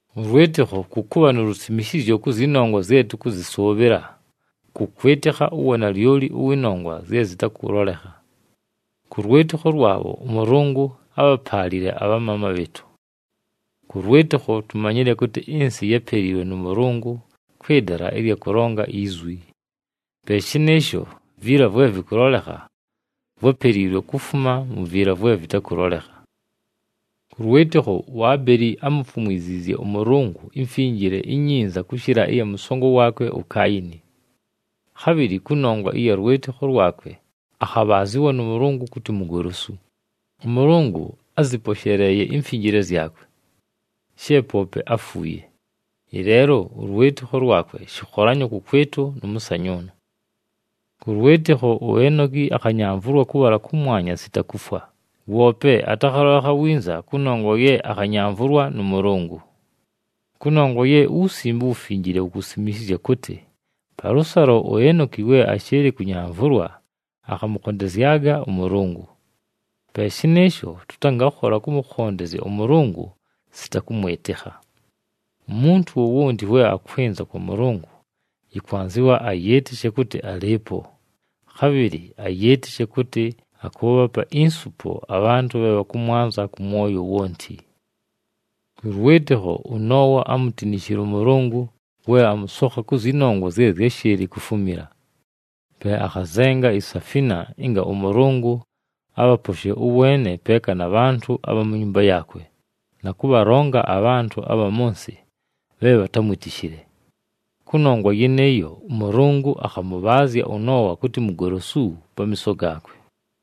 Ʉlwɨtɨkho kʉ kʉbha nu lusimishizyo kʉ zyɨ nongwa zye tʉkʉzɨsʉʉbhɨla, kʉ kwɨtɨkha uwanalyoli ʉwɨ nongwa zye zɨtakʉlolekha. Kʉ lwɨtɨkho lwabho, ʉMʉlʉngʉ ábhapaalile abhamaama bhɨɨtʉ. Kʉ lwɨtɨkho, tumanyile kʉtɨ ɨnsɨ yápeliilwe nʉ Mʉlʉngʉ kwɨ dala ɨlya kʉlonga izwi. Pe shɨnɨɨsho, viila vwe vɨkʉlolekha vwápeliilwe kufuma mu viila vwe vɨtakʉlolekha. Kʉ lwɨtɨkho, uAbeli ámufumwiziizye ʉMʉlʉngʉ imfinjile inyinza kʉshɨla ɨya mʉsongo waakwe uKaayini. Khabhɨlɨ kʉnongwa ɨya lwɨtɨkho lwakwe akhabhaazɨwa nʉ Mʉlʉngʉ kʉtɨ mugolosu, ʉMʉlʉngʉ ázɨposheleeye imfinjile zyakwe. She poope áfuuye, ɨleelo ʉlwɨtɨkho lwakwe shɨkholanyo kʉkwɨtʉ nʉ mʉsanyʉʉnʉ. Kʉ lwɨtɨkho, uEnoki akhanyamvʉlwa kʉbhala kʉmwanya sita kufwa, woope atakhalolekha winza kʉnongwa ye akhanyamvʉlwa nʉ Mʉlʉngʉ. Kʉnongwa ye uWusimbe uWufinjile wukusimishizya kʉtɨ palʉsalo uEnoki we ashɨɨlɨ kʉnyamvʉlwa akhamʉkhondezyaga ʉMʉlʉngʉ. Pe shɨnɨɨsho, tʉtangakhola kʉmʉkhondezya ʉMʉlʉngʉ sita kʉmwɨtɨkha. Umuntu wowonti we akwɨnza kwa Mʉlʉngʉ yɨkwanzɨwa ayɨɨtɨshe kʉtɨ alɨɨpo, khabhɨlɨ ayɨɨtɨshe kʉtɨ akʉʉbhapa insupo abhantʉ bhe bhakʉmwanza kʉ mwoyo wonti. Kʉ lwɨtɨkho, ʉNoowa ámutinishile ʉMʉlʉngʉ we amʉsokha kʉ zyɨ nongwa zye zyáshɨɨlɨ kufumila. Pe akhazenga isafina ɨnga ʉMʉlʉngʉ abhaposhe ʉweene peeka na bhantʉ abha mu nyumba yaakwe, na kʉbhalonga abhantʉ abha mʉ nsɨ bhe bhatámwitishile. Kʉnongwa yɨnɨɨyo, ʉMʉlʉngʉ akhamʉbhaazya ʉNoowa kʉtɨ mugolosu pamiiso gaakwe.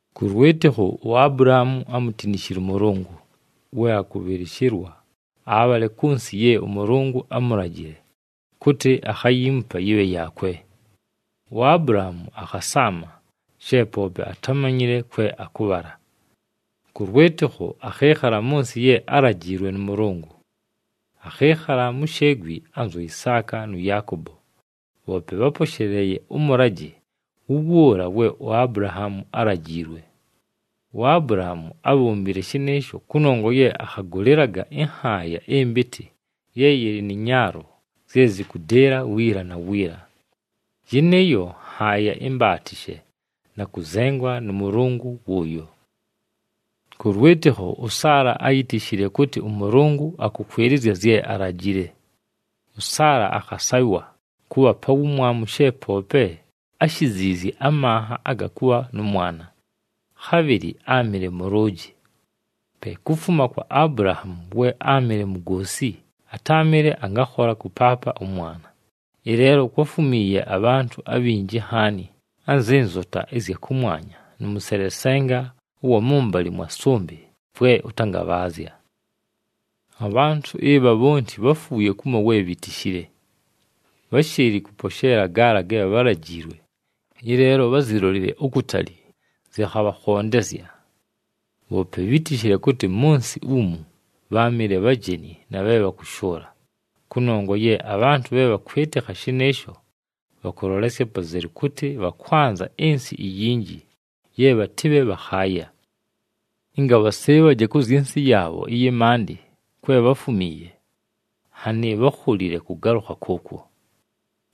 Kʉ lwɨtɨkho, uAbulahaamu ámutinishile ʉMʉlʉngʉ we akʉbhɨlɨshɨlwa abhale kʉ nsɨ ye ʉMʉlʉngʉ ámulajile kʉtɨ akhayiimupa yɨbhe yaakwe. UAbulahaamu akhasaama she poope atámanyile kwe akʉbhala. Kʉ lwɨtɨkho, akhɨɨkhala mʉ nsɨ ye álajiilwe nʉ Mʉlʉngʉ. Akhɨɨkhala mu sheegwi anzu Isaaka nʉ Yaakobo, bhoope bháposheleeye ʉmʉlajɨ wʉwʉʉla we uAbulahaamu álajiilwe. UAbulahaamu ábhombile shɨnɨɨsho kʉnongwa ye akhagʉlɨlaga ɨnhaaya ɨmpɨtɨ ye yɨlɨ nɨ nyaalo zye zɨkʉdɨɨla wiila na wiila. Yɨnɨɨyo nhaaya imbaatishe na kʉzengwa nʉ Mʉlʉngʉ wʉʉyo. Kʉ lwɨtɨkho, ʉSaala áyitishile kʉtɨ ʉMʉlʉngʉ akʉkwɨlɨzya zye alajile. ɄSaala akhasaywa kʉbha pa wumwamu she poope áshiziizye amanha aga kʉbha nʉ mwana, khabhɨlɨ áamɨle mʉlʉʉjɨ. Pe kufuma kwa Abulahaamu we áamɨle mugoosi atáamɨle angakhola kʉpaapa ʉmwana, ɨleelo kwáfumiiye abhantʉ abhinji nhaani anzɨ nzota ɨzya kʉmwanya nʉ mʉselesenga ʉwa mʉmbalɨ mwa sʉmbɨ vwe ʉtangabhaazya. Abhantʉ ɨbha bhonti bháfuuye kumo we bhitishile. Bháshɨɨlɨ kʉposheela gaala ge bhálajiilwe, ɨleelo bházilolile ukutali, zɨkhabhakhondezya. Bhoope bhítishile kʉtɨ mʉ nsɨ umu bháamɨle bhajeni na bhe bhakʉshʉʉla, kʉnongwa ye abhantʉ bhe bhakwɨtɨkha shɨnɨɨsho bhakʉlolesya apazelu kʉtɨ bhakwanza ɨnsɨ iyinji ye bhatɨbhe bhakhaaya. Ɨnga bhasɨɨbhaje kʉ zyɨ nsɨ yaabho ɨyɨ maandɨ kwe bháfumiiye, nhanɨ bhákholile kʉgalʉkha kʉʉkwo.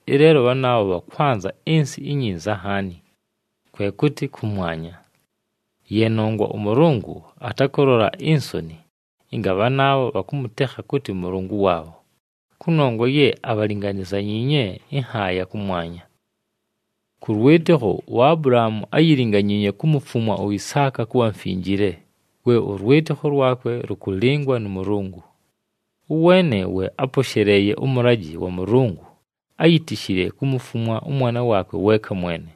Ɨleelo bhanaabho bhakwanza ɨnsɨ inyinza nhaani, kwe kʉtɨ kʉmwanya. Ye nongwa ʉMʉlʉngʉ atakʉlola insoni ɨnga bhanaabho bhakʉmʉtekha kʉtɨ Mʉlʉngʉ waabho, kʉnongwa ye abhalinganizanyiinye ɨnhaaya kʉmwanya. Kʉ lwɨtɨkho, uAbulahaamu áyilinganyiinye kumufumwa uIsaaka kʉbha mfinjile, we ʉlwɨtɨkho lwakwe lʉkʉlɨngwa nʉ Mʉlʉngʉ. Ʉweene we áposheleeye ʉmʉlajɨ wa Mʉlʉngʉ, áyitishile kumufumwa ʉmwana waakwe weeka mwene,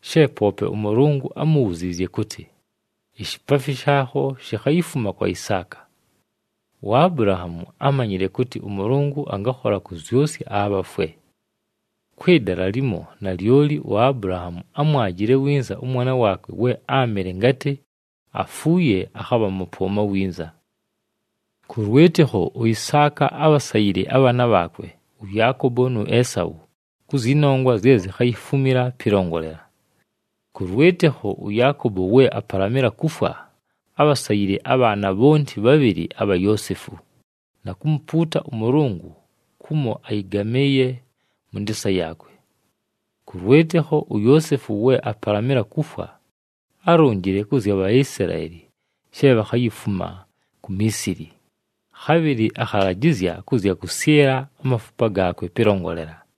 she poope ʉMʉlʉngʉ ámubhuziizye kʉtɨ, “Ishipaafi shaakho shikhayifuma kwa Isaaka.” UAbulahaamu ámanyile kʉtɨ ʉMʉlʉngʉ angakhola kʉzyʉsya abhafwe. Kwɨ dala limo, nalyoli uAbulahaamu ámwajile winza ʉmwana waakwe we áamɨle ngatɨ afuuye akhabha mʉpʉʉma winza. Kʉ lwɨtɨkho, uIsaaka ábhasayile abhaana bhaakwe, ʉYaakobo nu Esau kʉ zyɨ nongwa zye zikhayifumila pɨlongolela. Kʉ lwɨtɨkho, ʉYaakobo we apalamɨla kufwa, ábhasayile abhaana bhonti bhabhɨlɨ abha Yoosefu, na kumupuuta ʉMʉlʉngʉ kumo ayɨgamɨɨye mʉ ndɨɨsa yaakwe. Kʉ lwɨtɨkho, uYoosefu we apalamɨla kufwa, álonjile kʉ zya Bhaisilaeli she bhakhayifuma ku Miisili, khabhɨlɨ akhalajɨzya kʉ zya kʉsyɨla amafupa gaakwe pɨlongolela.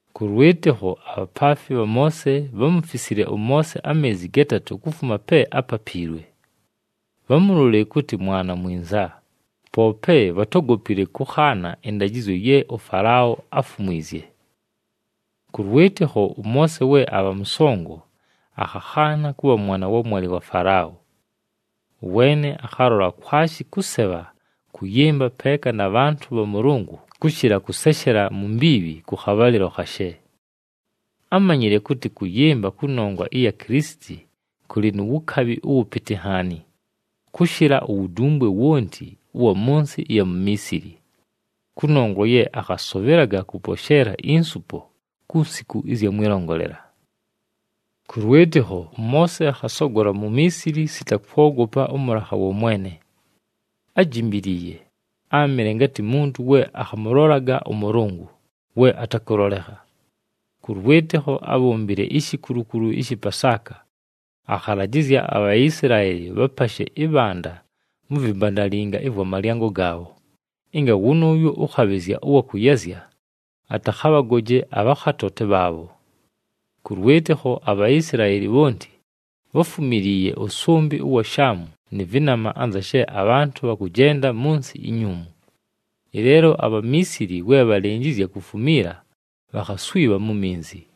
Kʉ lwɨtɨkho, abhapaafi bha Moose bhámufisile ʉMoose ameezi gatatʉ kufuma pe ápapiilwe. Bhámulolile kʉtɨ mwana mwinza, poope bhatógopile kʉkhaana ɨndajɨzyo ye ʉFalao áfumwizye. Kʉ lwɨtɨkho, ʉMoose we abha mʉsongo, akhakhaana kʉbha mwana wa mwalɨ wa Falao. Ʉweene akhalola kwashi kʉsebha kʉyɨmba peeka na bhantʉ bha Mʉlʉngʉ kʉshɨla kʉseshela mu mbiibhi kʉ khabhalɨlo khashe. Ámanyile kʉtɨ kʉyɨmba kʉnongwa ɨya Kilisiti kʉlɨ nu wukabhi ʉwʉpɨtɨ nhaani, kʉshɨla uwudumbwe wonti ʉwa mʉ nsɨ ɨya mu Miisili, kʉnongwa ye akhasʉbhɨlaga kʉposheela insupo ku nsiku ɨzya mwɨlongolela. Kʉ lwɨtɨkho, ʉMoose akhasogola mu Miisili sita kwogopa ʉmʉlakha wa mwene. Ájimbiliiye, áamɨle ngatɨ muntu we akhamʉlolaga ʉMʉlʉngʉ, we atakʉlolekha. Kʉ lwɨtɨkho, ábhombile ishikulukulu ɨshɨ Pasaaka, akhalajɨzya aBhaisilaeli bhapashe ɨbhanda mu vimbandalinga ɨvwa malyango gaabho, ɨnga wʉnʉʉyo ʉkhabhɨzya ʉwa kʉyazya atakhabhagoje abhakhatoote bhaabho. Kʉ lwɨtɨkho, aBhaisilaeli bhonti bháfumiliiye ʉsʉmbɨ ʉwa Shaamu nɨ vɨnama anza she abhantʉ bhakʉjenda mʉ nsɨ inyuumu. Ɨleelo aBhamiisili we bhalɨnjɨzya kufumiila, bhakhaswibha mu minzi.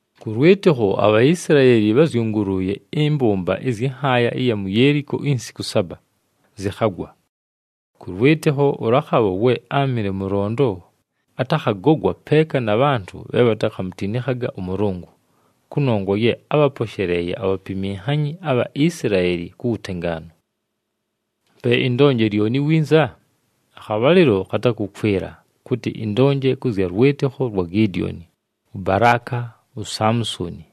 Kʉ lwɨtɨkho, aBhaisilaeli bházyʉngʉlʉʉye ɨmbʉmba ɨzyɨ nhaaya ɨya mu Yeeliko insiku saba, zɨkhagwa. Kʉ lwɨtɨkho, ʉLakhabho we áamɨle mʉlondo, atakhagogwa peeka na bhantʉ bhe bhatakhamutinikhaga ʉMʉlʉngʉ, kʉnongwa ye ábhaposheleeye abhapiminhanyi abha Isilaeli ku wutengaanu. Pe ɨndonje lyoni winza? Akhabhalɨlo khatakʉkwɨla, kʉtɨ ɨndonje kʉ zya lwɨtɨkho lwa Gidioni, ʉBalaaka, uSamusoni,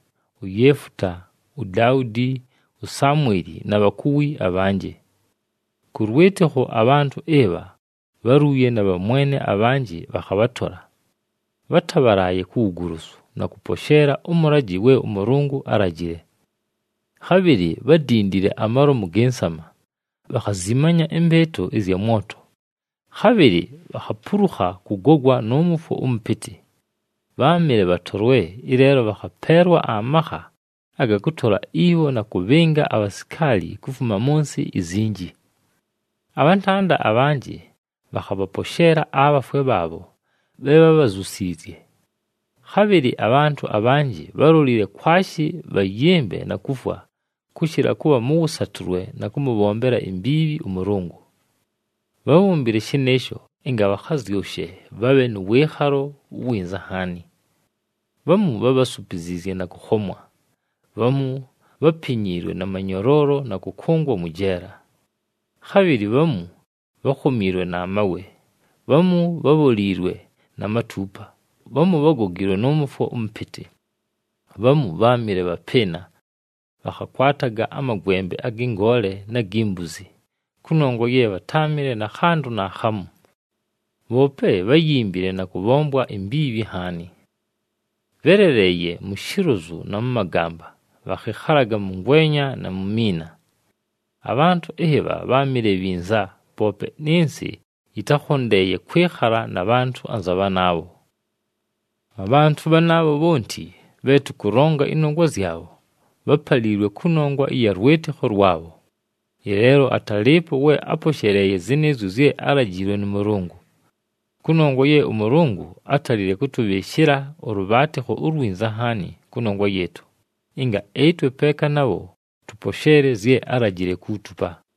uYeefuta, uDaudi, uSamweli na bhakuwi abhanjɨ. Kʉ lwɨtɨkho, abhantʉ ɨbha bháluuye na bhamwene abhanjɨ bhakhabhatola, bhátabhalaaye ku wugolosu, na kʉposheela ʉmʉlajɨ we ʉMʉlʉngʉ álajile. Khabhɨlɨ bhádindile amalomu gɨ nsama, bhakhazimanya ɨmbɨɨtʉ ɨzya mwoto, khabhɨlɨ bhakhapulukha kʉgogwa nʉ mʉfwo ʉmʉpɨtɨ. Bháamɨle bhatolwe, ɨleelo bhakhapeelwa amakha aga kʉtola ibho na kʉbhɨnga abhasikaali kufuma mʉ nsɨ izinji. Abhantanda abhanjɨ bhakhabhaposheela abhafwe bhaabho bhe bhábhazyusiizye. Khabhɨlɨ abhantʉ abhanjɨ bhálolile kwashi bhayɨmbe na kufwa, kʉshɨla kʉbha mʉ wʉsatʉlwe na kʉmʉbhombela imbiibhi ʉMʉlʉngʉ. Bhábhombile shɨnɨɨsho ɨnga bhakhazyʉshe bhabhe nʉ wɨɨkhalo uwinza nhaani. Bhamu bhábhasupiziizye na kʉkhomwa. Bhamu bhápinyiilwe na manyoloolo na kʉkʉngwa mwɨ jeela. Khabhɨlɨ bhamu bhákhomiilwe na mawe, bhamu bhabholiilwe na matuupa, bhamu bhágogiilwe nʉ mʉfwo ʉmʉpɨtɨ. Bhamu bháamɨle bhapɨɨna, bhakhakwataga amagwembe agɨ ngoole na gi mbuzi, kʉnongwa ye bhatáamɨle na khantʉ naakhamu. Bhoope bháyimbile na kʉbhombwa imbiibhi nhaani. Bhéleleeye mu shilozu na mʉ magamba, bhakhɨkhalaga mʉ ngwenya na mu miina. Abhantʉ ɨbha bháamɨle bhinza, poope nɨ nsɨ yɨtákhondeeye kwɨkhala na bhantʉ anza bhanaabho. Abhantʉ bhanaabho bhonti bhe tʉkʉlonga ɨnongwa zyabho, bhápaliilwe kʉnongwa ɨya lwɨtɨkho lwabho, ɨleelo atálɨɨpo we áposheleeye zɨnɨɨzyo zye álajiilwe nʉ Mʉlʉngʉ. Kʉnongwa ye ʉMʉlʉngʉ átalile kʉtʉbhɨɨshɨla ʉlʉbhaatɨkho ulwinza nhaani kʉnongwa yɨɨtʉ, ɨnga ɨtwe peeka nabho tʉposheele zye álajile kuutupa.